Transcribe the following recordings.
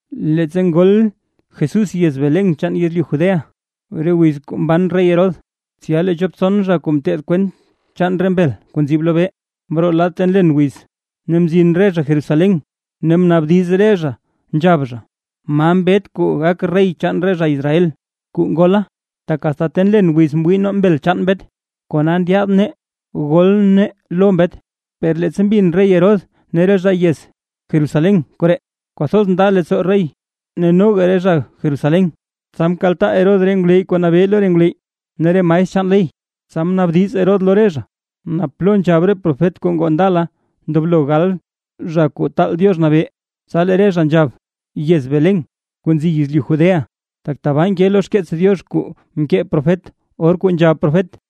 Leettsa ngol Jesús yez Belén chaan yezlyu Judea, re wiz kuu mban rey Herodes, tsya lee chop tson zha kuu nteed kwent chaan re mbel kuu nzib lobee, mroo lad ta nlen wiz, ne mzin re zha Jerusalén. Ne mnaabdiz re zha, nzhab zha: ―¿Ma mbet kuu gak rey chaan re zha Israel, kuu ngola? Tak asta ta nlen wiz mwii nee mbel chaan mbet, kona ndyaad nee gol nee lo mbet. Per leettsa mbin rey Herodes ne re zha yez Jerusalén koree, kwathoz nda leettsoo Herodes ne noga re zha Jerusalén. Tsa mkaltaa Herodes re ngwleyy kuu nabee lo re ngwleyy, ne re maestr chaan ley, tsa mnaabdiz Herodes lo re zha, naa plo nzhab re profet kuu ngoo ndala ndoblo gal Zha Kuu Taal Diox Nabee. Tsa lee re zha nzhab: ―Yez Belén, kuu nzi yezlyu Judea; tak tabaa nkey lo xkeets Diox kuu mkee profet, or kuu nzhab profet: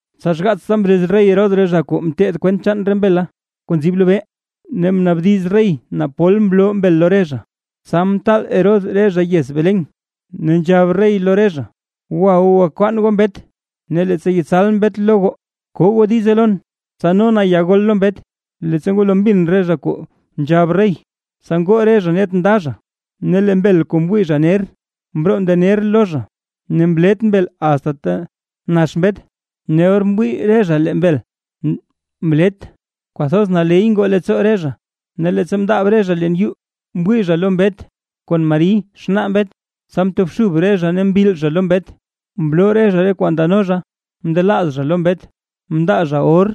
Tsa xgaatsta mrez rey Herodes re zha kuu nteed kwent chaan re mbel kuu nzib lobee, ne mnaabdiz rey naa pol mloo mbel lo re zha. Tsa mtaal Herodes re zha yez Belén, ne nzhab rey lo re zha: ―Gwa goo, gwakwaan goo mbet, ne leettsa yetsal mbet lo goo, ko goo diize lon, tsa no na ya gol lo mbet. Leettsa ngwalo mbin re zha kuu nzhab rey, tsa ngoo re zha net nda zha, ne lee mbel kuu mwii zha ner, mroo mndener lo re zha, ne mlet mbel asta ta nax mbet. Ne or mwii re zha lee mbel mlet, kwathoz naley ngoo leettsoo re zha. Ne leettsa mndaab re zha leen yuu, mwii zha lo mbet kon Mari xnaa mbet, tsa mtobxub re zha ne mbil zha lo mbet; ne mloo re zha re kwaa ndano zha mndelaaz zha lo mbet, mndaa zha or,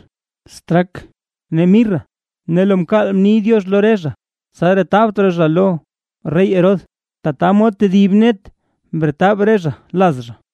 straak ne mirra. Ne lo mkaal mni Diox lo re zha, tsa retabt raa zha lo rey Herodes, tata mod tedib net mretab re zha laz zha.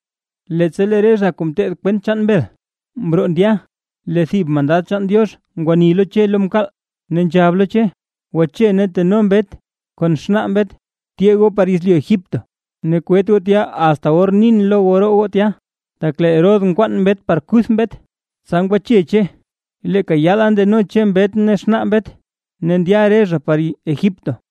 Leettsa lee re zha kuu nteed kwent chaan mbel mroo ndya, lee thib mandad chaan Diox ngwani lo Che lo mkaal ne nzhab lo Che: ―Gwache, ne teno mbet kon xnaa mbet, tyee goo par yezlyu Egipto, ne kwet goo tya asta or nin lo goo roo goo tya, tak lee rey Herodes nkwaan mbet par kuth mbet. Tsa ngwache Che, leeka yaala ndano Che mbet ne xnaa mbet, ne ndya re zha par Egipto,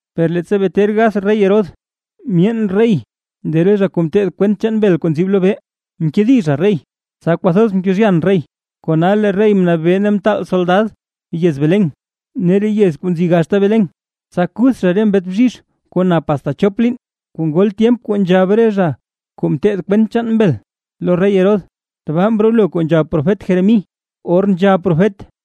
Per leettsa bee ter gath rey Herodes, myeen rey lee re zha kuu nteed kwent chaan mbel kuu nzib lobee, mkedi zha rey, tsa kwathoz mkezhyan rey, kona lee rey mnabee ne mtaal soldad yez Belén ne re yez kuu nzi gaxta Belén, tsa kuth zha re mbet bzhizh kuu nap asta chop liin, kuu ngol tyemp kuu nzhab re zha kuu nteed kwent chaan mbel lo rey Herodes. Tbaa mrolo kuu nzhab profet Jeremí, or nzhab profet: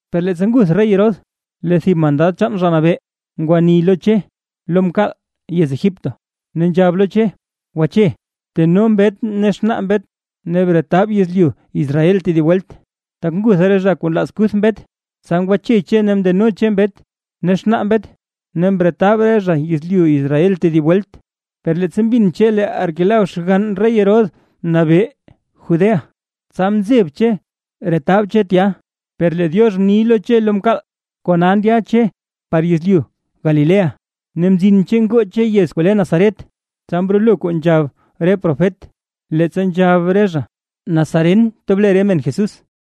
Per leettsa ngutha rey Herodes, lee thib mandad chaan Zha Nabee ngwani lo Che lo mkaal yez Egipto, ne nzhab lo Che: ―Gwache, teno mbet ne xnaa mbet ne bretab yezlyu Israel tedib welt, tak ngutha re zha kuu nlaaz kuth mbet. Tsa ngwache Che ne mndeno Che mbet ne xnaa mbet, ne mretab re zha yezlyu Israel tedib welt. Per leettsa mbin Che lee Arquelao xgann rey Herodes nabee Judea, tsa mzeb Che retab Che tya; per lee Diox mni lo Che lo mkaal; kona ndya Che par yezlyu Galilea. Ne mzin Che ngoo Che yez kuu le Nazaret. Tsa mrolo kuu nzhab re profet, leettsa nzhab re zha: “Nazaren tob le re men Jesús”.